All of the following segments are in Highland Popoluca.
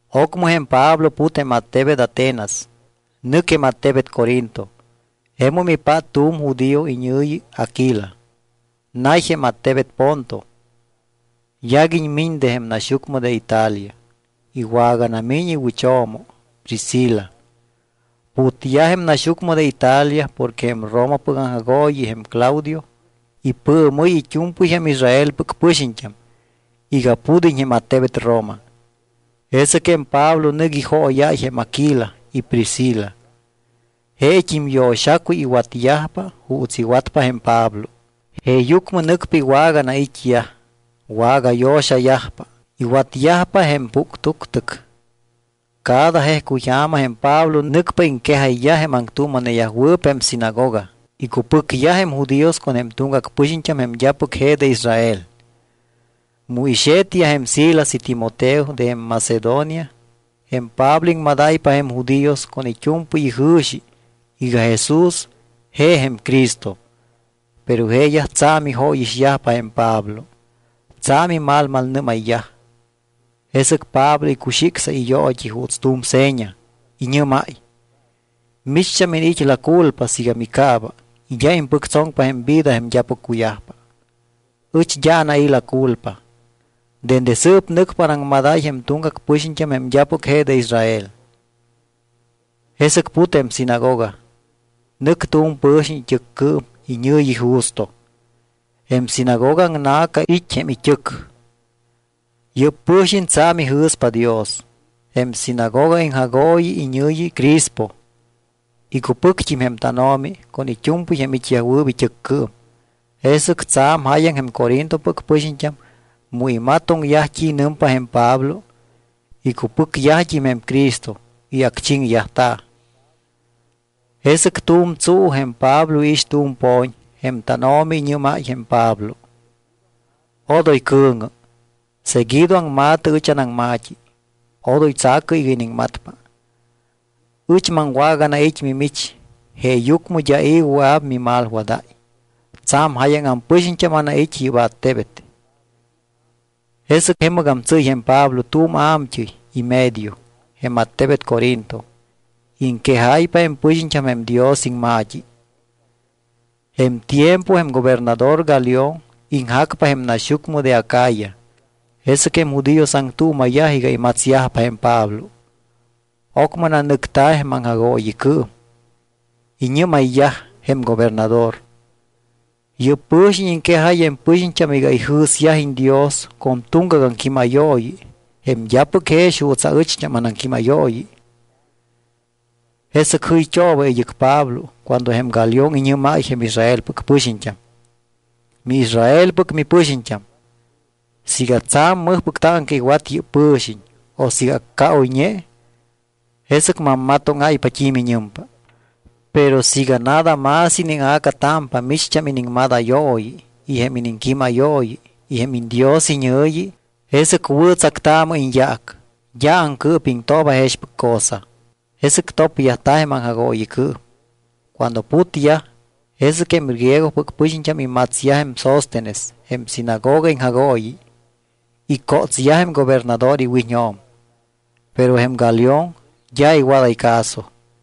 Ocmɨ jém Pablo put jém attebet Atenas. Nɨc jém attebet Corinto. Jemum ipát tu̱m judío iñɨ̱yi Aquila. Nay jém attebet Ponto. Yaguiñ miñ de jém naxyucmɨ de Italia. Iwaganamiñ iwɨcho̱mo Priscila. Putyaj jém naxyucmɨ de Italia porque jém Romapɨc aŋjagooyi jém Claudio ipɨɨmɨ́y it́u̱mpɨy jém Israelpɨc pɨxiñt́am iga pud́iñ jém attebet Roma. Jesɨc jém Pablo nɨc ijooyáy jém Aquila y Priscila. Jeet́im yo̱xacuy iwatyajpa juuts iwatpa jém Pablo. Jeeyucmɨ nɨcpa iwaganait́yaj. Wagayo̱xayajpa. Iwatyajpa jém puctuctɨc. Cada jejcuy ja̱ma jém Pablo nɨcpa iŋquejayyaj jém aŋtuuma̱neyajwɨɨp jém sinagoga. Iccupɨcyaj jém judíos con jém tuŋgac pɨxiñt́am jém d́apɨc je de Israel. Mu ixe̱tyaj jém Silas y Timoteo de jém Macedonia jém Pablo iŋmadáypa jém judíos con it́u̱mpɨy ijɨ̱xi iga Jesús je jém Cristo. Pero jeeyaj tsa̱m ijóyixyajpa jém Pablo. Tsa̱m imalmalnɨ́mayyaj. Jesɨc Pablo icuxicsáy iyoot́i juuts tu̱m seña. Iñɨ́máy: —Micht́am iniit́ la culpa siiga micaaba y d́a impɨctsoŋpa jém vida jém d́apɨc cuyajpa. Ɨch d́a anai̱ la culpa. Dende sɨɨp nɨcpa anaŋmadáy jém tuŋgac pɨxiñt́am jém d́apɨc je de Israel. Jesɨc put jém sinagoga, nɨc tu̱m pɨ̱xiñ it́ɨccɨɨm iñɨ̱yi Justo. Jém sinagoga aŋna̱ca it́ jém it́ɨc. Yɨ́p pɨ̱xiñ tsa̱m ijɨ̱spa Dios. Jém sinagoga iŋjagooyi iñɨ̱yi Crispo. Icupɨct́im jém tánO̱mi con it́u̱mpɨy jém it́yajwɨɨp it́ɨccɨɨm. Jesɨc tsa̱m jáyaŋ jém Corintopɨc pɨxiñt́am mu imatoŋyaj t́i nɨmpa jém Pablo, icupɨcyajt́im jém Cristo y acchiŋyajta̱. Jesɨc tu̱m tsuu jém Pablo iix tu̱m po̱ñ. Jém tánO̱mi iñɨ́máy jém Pablo: —Odoy cɨ̱ŋɨ. Seguido aŋma̱tɨ ɨch anaŋma̱t́i. Odoy tsa̱cɨ iga iniŋmatpa. Ɨch maŋwaganait́ mimich jeeyucmɨ d́a i̱ wɨa̱p mimalwadáy. Tsa̱m jáyaŋ ampɨxiñt́am anait́ yɨ́p attebet. Jesɨc jemɨgam tsɨ́y jém Pablo tu̱m a̱mt́ɨy y medio jém attebet Corinto. Iŋquejáypa jém pɨxiñt́am jém Dios iŋma̱t́i. Jém tiempo jém gobernador Galión iŋjacpa jém naxyucmɨ de Acaya. Jesɨc jém judíos aŋtuuma̱yaj iga imatsyajpa jém Pablo. Ocmɨ nanɨcta̱ jém aŋjagooyicɨɨm. Iñɨ́mayyaj jém gobernador: —Yɨ́p pɨ̱xiñ iŋquejáy jém pɨxiñt́am iga ijɨ̱syajiñ Dios con tuŋgac aŋquímayooyi jém d́apɨc jex juuts aɨcht́am anaŋquímayooyi. Jesɨc jɨyt́ooba id́ɨc Pablo cuando jém Galión iñɨ́máy jém Israelpɨc pɨxiñt́am: —MiIsraelpɨc mipɨxiñt́am, siiga tsa̱m mɨjpɨc táŋca iwat yɨ́p pɨ̱xiñ o siiga accaoyñe, jesɨc mammatóŋáypa t́i miñɨmpa. Pero siiga nada más iníŋa̱catámpa micht́am iniŋmadayooyi y jém iniŋquímayooyi y jém iñDios iñɨ̱yi, jesɨc wɨ̱tsactaamɨ iñyaac. D́a aŋcɨɨpiŋtooba jexpɨc cosa. Jesɨc topyajta̱ jém aŋjagooyicɨɨm. Cuando putyaj, jesɨc jém griegopɨc pɨxiñt́am imatsyaj jém Sóstenes jém sinagoga iŋjagooyi, icótsyaj jém gobernador iwiñjo̱m. Pero jém Galión d́a iwadáy caso.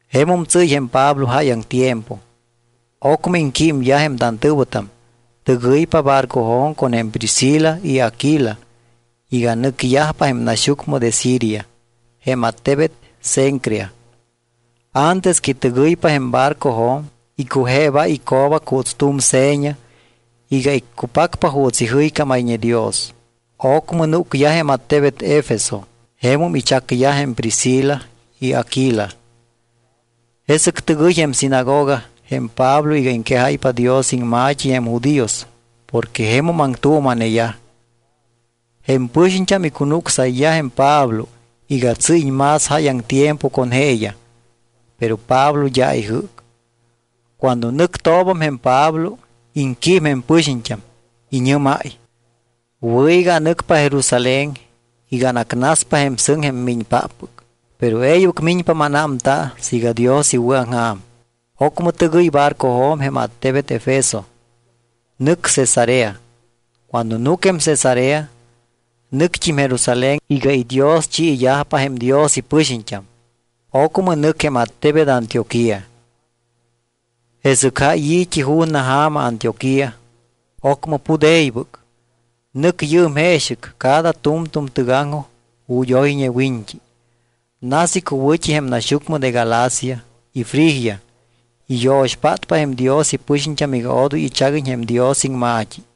Jemum tsɨ́y jém Pablo jáyaŋ tiempo. Ocmɨ iŋquímyaj jém tantɨ̱wɨtam, tɨgɨypa barcojo̱m con jém Priscila y Aquila iga nɨcyajpa jém naxyucmɨ de Siria, jém attebet Cencrea. Antes que tɨgɨypa jém barcojo̱m, icujeebáy ico̱bac juuts tu̱m seña iga iccupacpa juuts ijɨycámayñe Dios. Ocmɨ núcyaj jém attebet Efeso. Jemum ichacyaj jém Priscila y Aquila. Jesɨc tɨgɨy jém sinagoga jém Pablo iga iŋquejáypa Dios iŋma̱t́i jém judíos porque jemum aŋtuuma̱neyaj. Jém pɨxiñt́am icunucsayyaj jém Pablo iga tsɨ́yiñ más jáyaŋ tiempo con jeeyaj, pero Pablo d́a ijɨ́c. Cuando nɨctoobam jém Pablo, iŋquím jém pɨxiñt́am. Iñɨ́máy: —Wɨ̱ iga anɨcpa Jerusalén iga anacnaspa jém sɨŋ jém miñpáppɨc. Pero e̱ybɨc miñpa mánámta siiga Dios iwɨ̱aŋja̱m. Ocmɨ tɨgɨy barcojo̱m jém attebet Efeso. Nɨc Cesarea. Cuando núc jém Cesarea, nɨct́im Jerusalén iga idioschiyajpa jém Dios ipɨxiñt́am. Ocmɨ nɨc jém attebet Antioquía. Jesɨc jáy i̱t́i ju̱na ja̱ma Antioquía. Ocmɨ put e̱ybɨc. Nɨc yɨɨm jeexɨc cada tu̱mtu̱m tɨgaŋjoj ju̱t́ oyñe wiñt́i. Nas icuwɨ̱t́i jém naxyucmɨ de Galacia y Frigia. Iyo̱xpátpa jém Dios ipɨxiñt́am iga odoy ichaguiñ jém Dios iŋma̱t́i.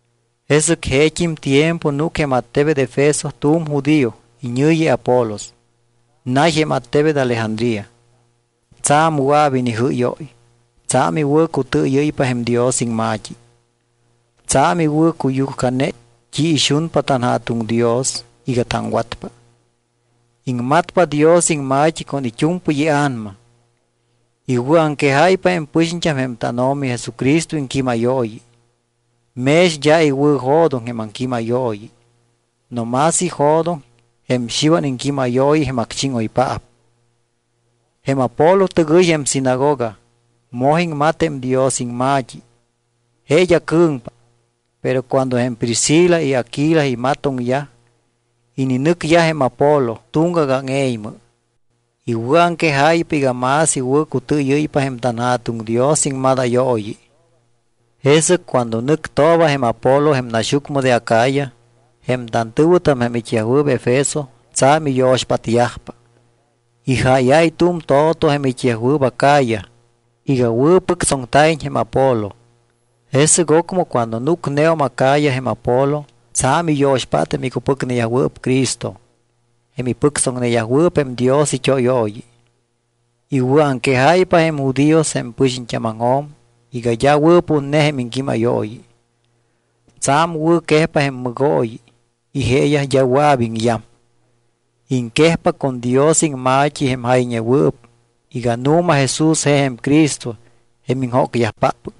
Jesɨc jeet́im tiempo núc jém attebet Efeso tu̱m judío iñɨ̱yi Apolos. Nay jém attebet Alejandría. Tsa̱m wɨa̱p inijɨ́yóy. Tsa̱m iwɨ̱cutɨɨyɨ́ypa jém Dios iŋma̱t́i. Tsa̱m iwɨ̱cuyujcane t́i ixunpa tanJa̱tuŋ Dios iga taŋwatpa. Iŋmatpa Dios iŋma̱t́i con it́u̱mpɨy ia̱nama. Iwɨ̱aŋquejáypa jém pɨxiñt́am jém tánO̱mi Jesucristo iŋquímayooyi. Mex d́a iwɨ̱jo̱doŋ jém aŋquímayooyi, no más ijo̱doŋ jém Xiwan iŋquímayooyi jém acchíŋoypaap. Jém Apolo tɨgɨy jém sinagoga, moj iŋmat jém Dios iŋma̱t́i. Je d́a cɨ̱ŋpa. Pero cuando jém Priscila y Aguila imatoŋyaj, ininɨcyaj jém Apolo tuŋgac áŋe̱ymɨ. Iwɨ̱aŋquejáypa iga más iwɨ̱cutɨɨyɨ́ypa jém tanJa̱tuŋ Dios iŋmadayooyi. Jesɨc cuando nɨctooba jém Apolo jém naxyucmɨ de Acaya, jém tantɨ̱wɨtam jém it́yajwɨɨp Efeso tsa̱m iyo̱xpátyajpa. Ijáyáy tu̱m to̱to jém it́yajwɨɨp Acaya iga wɨ̱pɨctsoŋta̱iñ jém Apolo. Jesɨc ocmɨ cuando núcneum Acaya jém Apolo, tsa̱m iyo̱xpát jém icupɨcneyajwɨɨp Cristo, jém ipɨctsoŋneyajwɨɨp jém Dios it́óyooyi. Iwɨ̱aŋquejáypa jém judíos jém pɨxiñt́ámaŋjo̱m iga d́a wɨ̱putne jém iŋquímayooyi. Tsa̱m wɨ̱quejpa jém mɨgooyi y jeeyaj d́a wɨa̱p iŋyam. Iŋquejpa con Dios iŋma̱t́i jém jayñewɨɨp iga nu̱ma Jesús je jém Cristo jém iŋjócyajpáppɨc.